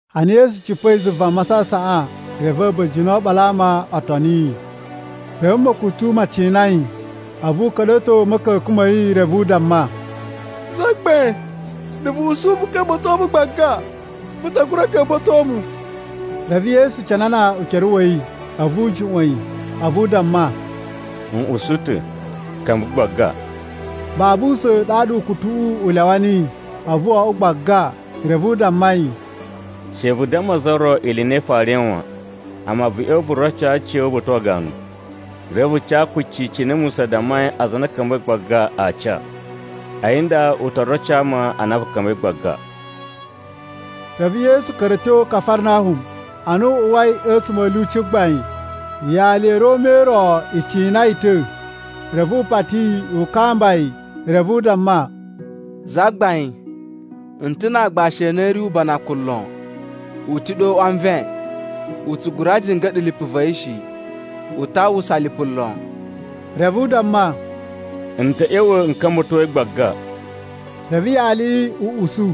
Ana Yesu cipa̱i zuva masasaꞌan, reve a̱ba̱jini o oɓolo a ama o toni yi. Reve ma̱kutu ma cina yi. A̱vu u ka̱ɗa̱to a̱ ma̱ka̱ka̱n ma̱ yi reve u damma, “Zagbain, na̱ vu usu vu ka̱mba̱to mu gbaga, vu ta gura ka̱mba̱to mu.” Reve Yesu canana ukere wa̱ yi, a̱vu u juꞌwa̱n yi a̱vu u damma, “N usu ta̱. Ka̱mba̱ gbaga!” Babu usa̱n ɗaɗa ukutuꞌu u lyawa niyi, a̱vu wo oꞌwo gbaga! Reve u damma yi, “She vu damma za ro ili i na i farai wan. Amma vu ꞌya̱wa̱ vu roco aciya̱wu uba̱ta̱ wa ganu, reve vu ca kucci cine Musa dammai aza a na a̱ ka̱mba̱i gbaga a ca. A̱yi nda u to roco ama a na vu ka̱mba̱i gbaga.” Reve Yesu ka̱ra̱ a̱ tyo Kafarnahum. Ana u uwai a̱tsuma̱ a̱ lyuci gbain, yali ya̱ Roma i ro i cina yi ta̱, reve u pati yi u kamba yi. Reve u damma, “Zagbain, n ta̱ na aagbashi a na a̱ ri ubanakun lon. U ta̱ ɗe o uꞌwa nven, u tsu gura jinga̱ɗa̱ lipu va̱ yi shi. U ta uwwusa lipu lon.” Reve u damma, “N ta̱ ꞌya̱wa̱ n ka̱mba̱to yi gbaga.” Reve yaliꞌi u usu,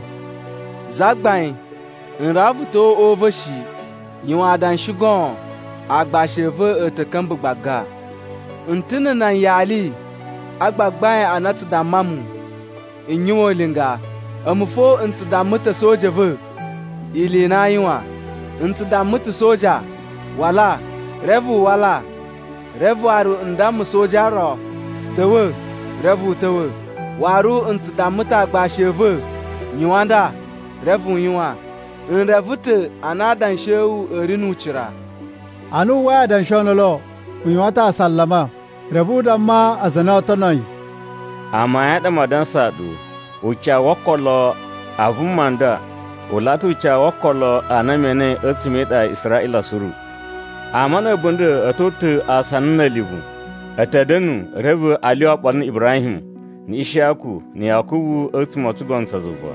“Zagbain, n rawa vu ta̱wa̱ o uꞌwa u va̱ shi. Yuwan adanshi goon, aagbashi a̱ va̱ a̱ ta̱ ka̱mba̱ gbaga. N ta̱ na̱ nan yali a gbagbain a na a tsu damma mu n yuwan ulinga, a̱mu fo n tsu damma ta̱ a̱soja a̱ va̱ ili i na aa yuwan. N tsu damma ta̱ soja, ‘Wala,’ reve u wala. Reve waru n damma soja ro, ‘Ta̱wa̱,’ reve u ta̱wa̱. Waru n tsu damma ta̱ aagbashi a̱ va̱, ‘Yuwan nda,’ reve u yuwan. N reve ta̱ a na adanshi a̱ wu a̱ ri nu ucira.” Ana wu uwwai adanshi o ndolo, u yuwan ta̱ asalama. Reve u damma aza a na oo tono yi, “Amayun a ɗa maa dansaa ɗu, ucawu wo okolo a vuma nda u laꞌa ta̱ ucawu wo okolo a na me enei a̱tsuma̱ e iɗa ya Israꞌila suru. Ama na̱ a̱bunda̱ a̱ to uta̱ asana na̱ a̱livu, a̱ ta̱ da̱nu, reve a lyuwa oɓolo na̱ Ibrahim, na̱ Ishiyaku, na̱ Yakubu a̱tsuma̱ o tsugono tsa zuva.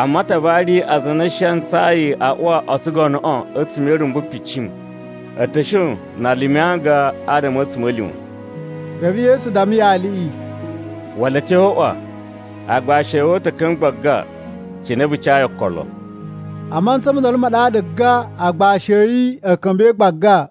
Amma a ta vari aza a na a̱ shi a ntsayi a uwa o tsugonoꞌo a̱tsuma̱ e irumbu picim. A̱ ta̱ shon na a lumi anga adama a̱ a̱tsuma̱lima̱.” Reve Yesu damma yaliꞌi, “Wala a̱ tyo o uꞌwa. Aagbashi a̱ wu a̱ ta̱ ka̱mba̱ gbaga cine vu cayi okolo.” A mantsa mo ndolo ma ɗaɗa gan aagbashi a̱ yi a̱ ka̱mba̱i gbaga.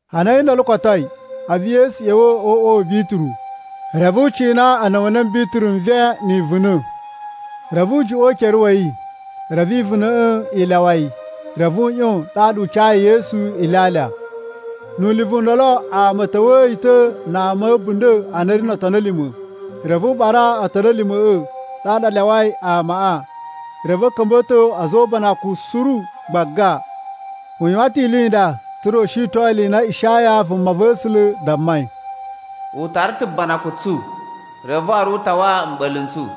Ana a̱yi ndolo kotoi, a̱vu Yesu ꞌya̱wa̱ o uꞌwa wa̱ Bituru, reve u cina a̱na̱wa̱le Bituru nven ni ivuna̱. Reve u juꞌwa̱n ukere wa̱ yi, reve ivuna̱ꞌa̱ i lyawa yi, reve u ꞌyon ɗaɗa u cayi Yesu ilyalya. Nu ulivu u ndolo ama a̱ ta̱wa̱a̱ yi ta̱ na ama a̱ a̱bunda̱ a na a̱ ri no otoni a̱ lima̱. Reve u ɓara otoni a̱ lima̱ꞌa̱ ɗaɗa a lyawai amaꞌa, reve u ka̱mba̱to a̱za̱ o ubanakuꞌun suru gbaga. U yuwan ta̱ ili i nda tsa̱ra̱ u shiton ili i na Ishaya vumava̱sula̱ dammai: “U tara ta̱ banakun tsu, reve waru u tawa mɓa̱la̱ n tsu.”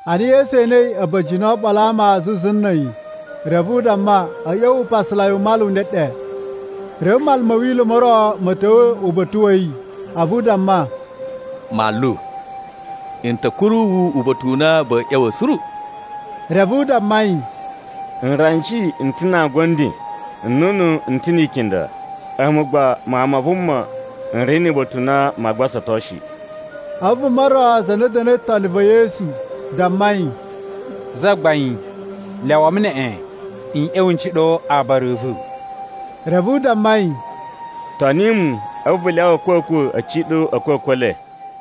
Ana Yesu enei a̱ba̱jini o oɓolo a ama zuzu na̱ a̱yi, reve u damma a̱ ꞌya̱wa̱ upasalai u mala u ndeɗe. Reve manlu ma̱ Wila̱ mo ro ma̱ ta̱wa̱ uba̱ta̱ wa̱ yi a̱vu u damma, “Manlu, n ta̱ kuru wu uba̱ta̱ u na va̱a̱ ꞌya̱wa̱ suru.” Reve u damma yi, “Nranji n ta̱ na angu a̱ nden, nnunu n ta̱ ni ikinda, a̱mu agba, Mawun ma Vuma n ri nu uba̱ta̱ u na maa gbasato shi.” A̱vu vuma ro za na da̱na̱i toni va̱ Yesu, damma yi, “Zagbain, lyawa mu neꞌen n ꞌya̱wa̱ n ciɗo aabara a̱ va̱.” Reve u damma yi, “Toni mu, a̱vu vu lyawa a̱kwa̱kwa̱ a̱ ciɗo a̱kwa̱kwa̱ e le.”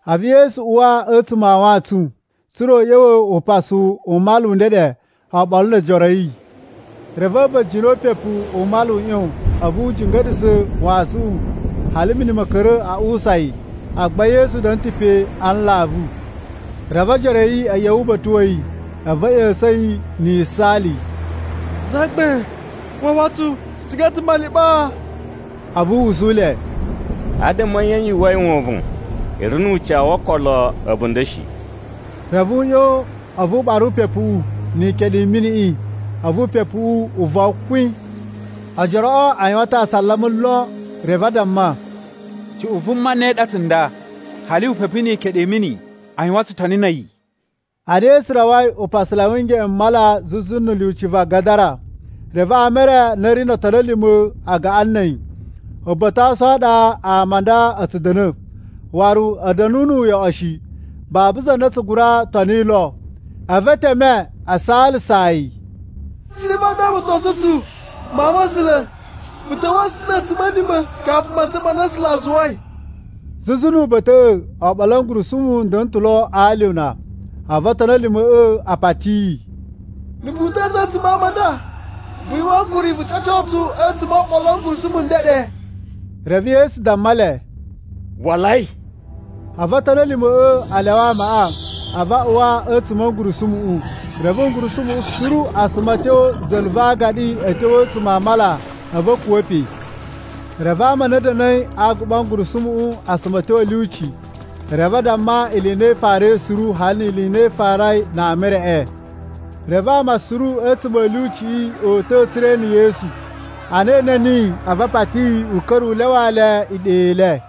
A̱vu Yesu uwa a̱tsuma̱ a wantsun, tsa̱ra̱ u ꞌya̱wa̱ upasu u mala u ndeɗe oɓolo no ojoro a̱ yi. Reve a̱ba̱jini o upepu u mala u ꞌyon, a̱vu u jinga̱ɗa̱sa̱ wantsuꞌun, hali mini ma̱ ka̱ra̱ a uwusa yi, agba Yesu da̱na̱ ta̱ pe a nlavu. Reve ojoro a̱ yi a̱ ꞌya̱wa̱ uba̱ta̱ wa̱ yi, a̱vu a̱ ꞌya̱sa̱n yi na̱ yisaali, “Zagbain, wawa tsu! Tsu ciga ta̱ maliɓaa!” A̱vu u usu le, “Adama a̱ nye yu uwwai wovon? I ri nu ucawu wo okolo a̱bunda̱ shi.” Reve u ꞌyon a̱vu u ɓara upepuꞌu ni ikeɗu i miniꞌi, a̱vu upepuꞌu u von kwin. Ojoroꞌo a yuwan ta̱ asalama lon reve a damma, “Cuꞌun vuma ne ɗa tsunda? Hali upepu ni ikeɗu i mini a yuwan tsutoni na̱ a̱yi!” Ana Yesu rawai upasalai wu ngeꞌen u mala zuzu na̱ lyuci va Gadara, reve ama e re a na a̱ ri no otoni a̱ lima̱ a gaꞌan na̱ a̱yi. Uba̱ta̱ wa ason a ɗa ama a nda a̱ tsu da̱na̱, waru a̱ da̱na̱ nu uyoꞌo shi, babu za na tsu gura toni lo. A̱vu e teme a saalasaa yi, “Cine vaa damatosun tsu, Mawun ma̱ A̱sula̱? Vu ta̱wa̱a̱ tsu ta̱ na̱ a̱tsuma̱lima̱ kafu mantsa ma na A̱sula̱ a zuwai!” Zuzu nu uba̱ta̱ꞌa̱, oɓolo a̱ ngurusumu a̱ da̱na̱ ta̱ lo a alyuna. A̱vu otoni a̱ lima̱ꞌa̱ a pati yi, “Na̱ vu uta̱a̱ tsu a̱tsuma̱ a ama a nda, vu yuwan ankuri vu ca̱co tsu a̱tsuma̱ o oɓolo a̱ ngurusumu a̱ ndeɗe.” Reve Yesu damma le, “Walai!” A̱vu otoni a̱ lima̱ꞌa̱ a lyawa amaꞌa, a̱vu a uwa a̱tsuma̱ a̱ ngurusumuꞌu. Reve ngurusumuꞌu suru a suma a̱ tyo za̱la̱ va agaɗi a̱ tyo a̱tsuma̱ a mala, a̱vu a̱ kuwa̱ pe. Reve ama a na a̱ da̱na̱i a aguɓa a̱ ngurusumuꞌu, a suma a̱ tyo a̱ lyuci, reve a damma ili i na i farai suru, hali ni ili i na i farai na ama e reꞌe. Reve ama suru a̱tsuma̱ a̱ lyuciꞌi o uta̱ tsa̱ra̱ e ene Yesu. Ana e ene niyi, a̱vu a pati yi u ka̱ra̱ u lyawaa le iɗa i le.